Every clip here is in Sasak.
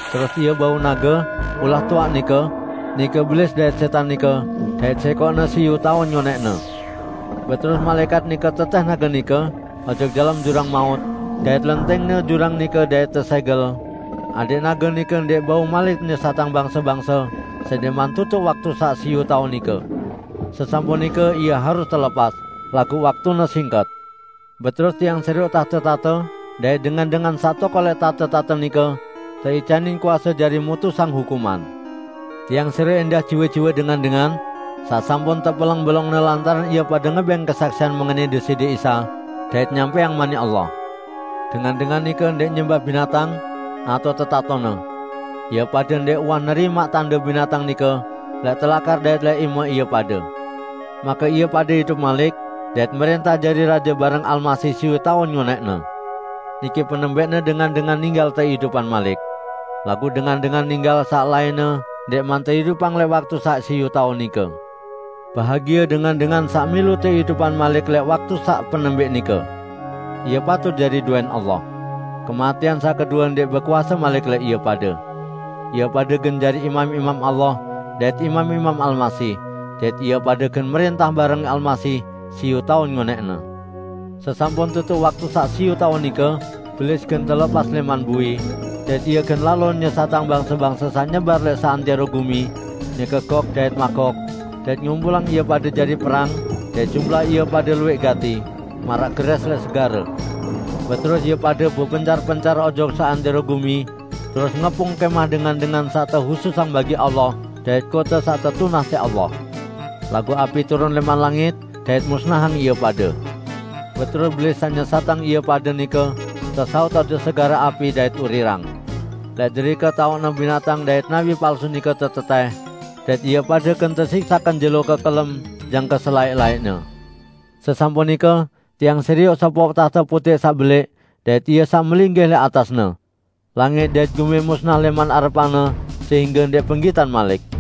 Terus ie bau nage, ulah toaq nike, -- nike Belis dait Sẽtan nike -- dait sẽkoqne siyu taun ngonẽqne. Beterus malaẽkat nike tetẽh nage nike ojok dalem jurang maut, dait lentingne jurang nike dait tesẽgel, adẽq nage nike ndẽq bau malik nyesatang bangse-bangse sendẽqman tutuq waktu saq siyu taun nike. Sesampun nike ie harus telepas, laguq waktune singket. Beterus tiang serioq tahte-tahte, dait dengan-dengan saq tokol lẽq tahte-tahte nike teicanin kuase jari mutusang hukuman. Tiang serioq ẽndah jiwe-jiwe dengan-dengan saq sampun tepeleng belongne lantaran ie pade ngebẽng kesaksian mengenai Deside Isa, dait nyampẽang Manik Allah. Dengan-dengan nike ndẽq nyembah binatang, atao tetatone. Ie pade ndẽq uwah nerimaq tande binatang nike lẽq telakar dait lẽq ime ie pade. Make ie pade idup malik dait mrẽntah jari raje bareng Almasih siyu taun ngonẽqne. Niki penembẽqne dengan-dengan ninggal teidupang malik. (Laguq dengan-dengan ninggal saq lainne ndẽqman teidupang lẽq waktu saq siyu taun nike.) Bahagie dengan-dengan saq milu teidupang malik lẽq waktu saq penembẽq nike. Ie pade patut jari dowẽn Allah. Kematẽan saq kedue ndẽq bekuase malik lẽq ie pade. Ie pade gen jari imam-imam Allah dait imam-imam Almasih; dait ie pade gen mrẽntah bareng Almasih siyu taun ngonẽqne. Sesampun tutuq waktu saq siyu taun nike, Belis gen telepas lẽman bui, dait ie gen lalo nyesatang bangse-bangse saq nyebar lẽq seantẽro gumi, nike Gog dait Magoq, dait ngumpulang ie pade jari perang dait jumlah ie pade luwẽq gati, maraq gerẽs lẽq segare. Beterus ie pade bepencar-pencar ojok seantẽro gumi, terus ngepung kẽmah dengan-dengan saq tehususang bagi Allah dait kote saq tetunah siq Allah. Laguq api turun lẽman langit dait musnahang ie pade. Beterus Belis saq nyesatang ie pade nike, tesaut ojok segare api dait urirang. Lẽq derike taoqne binatang dait nabi palsu nike tetetẽh, dait ie pade gen tesiksaq kenjelo kekelem jangke selaẽq-laẽqne. Sesampun nike tiang serioq sopoq tahte putẽq saq belẽq dait Ie saq melinggih lẽq atasne. Langit dait gumi musnah lẽman arepan-Ne, sehingge ndẽq penggitan malik.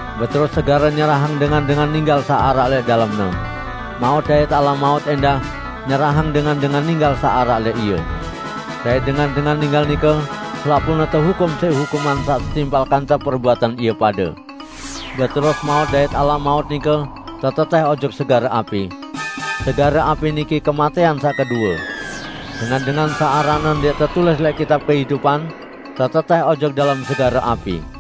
Beterus segare nyerahang dengan-dengan ninggal saq araq lẽq dalemne. Maut dait Alam Maut ẽndah nyerahang dengan-dengan ninggal saq araq lẽq ie. Dait dengan-dengan ninggal nike selapuqne tehukum siq hukuman saq setimpal kance perbuatan ie pade. Beterus Maut dait Alam Maut nike tetetẽh ojok segare api. (Segare api niki kematẽan saq kedue.) Dengan-dengan saq aranne ndẽq tetulis lẽq kitab kehidupan, tetetẽh ojok dalem segare api.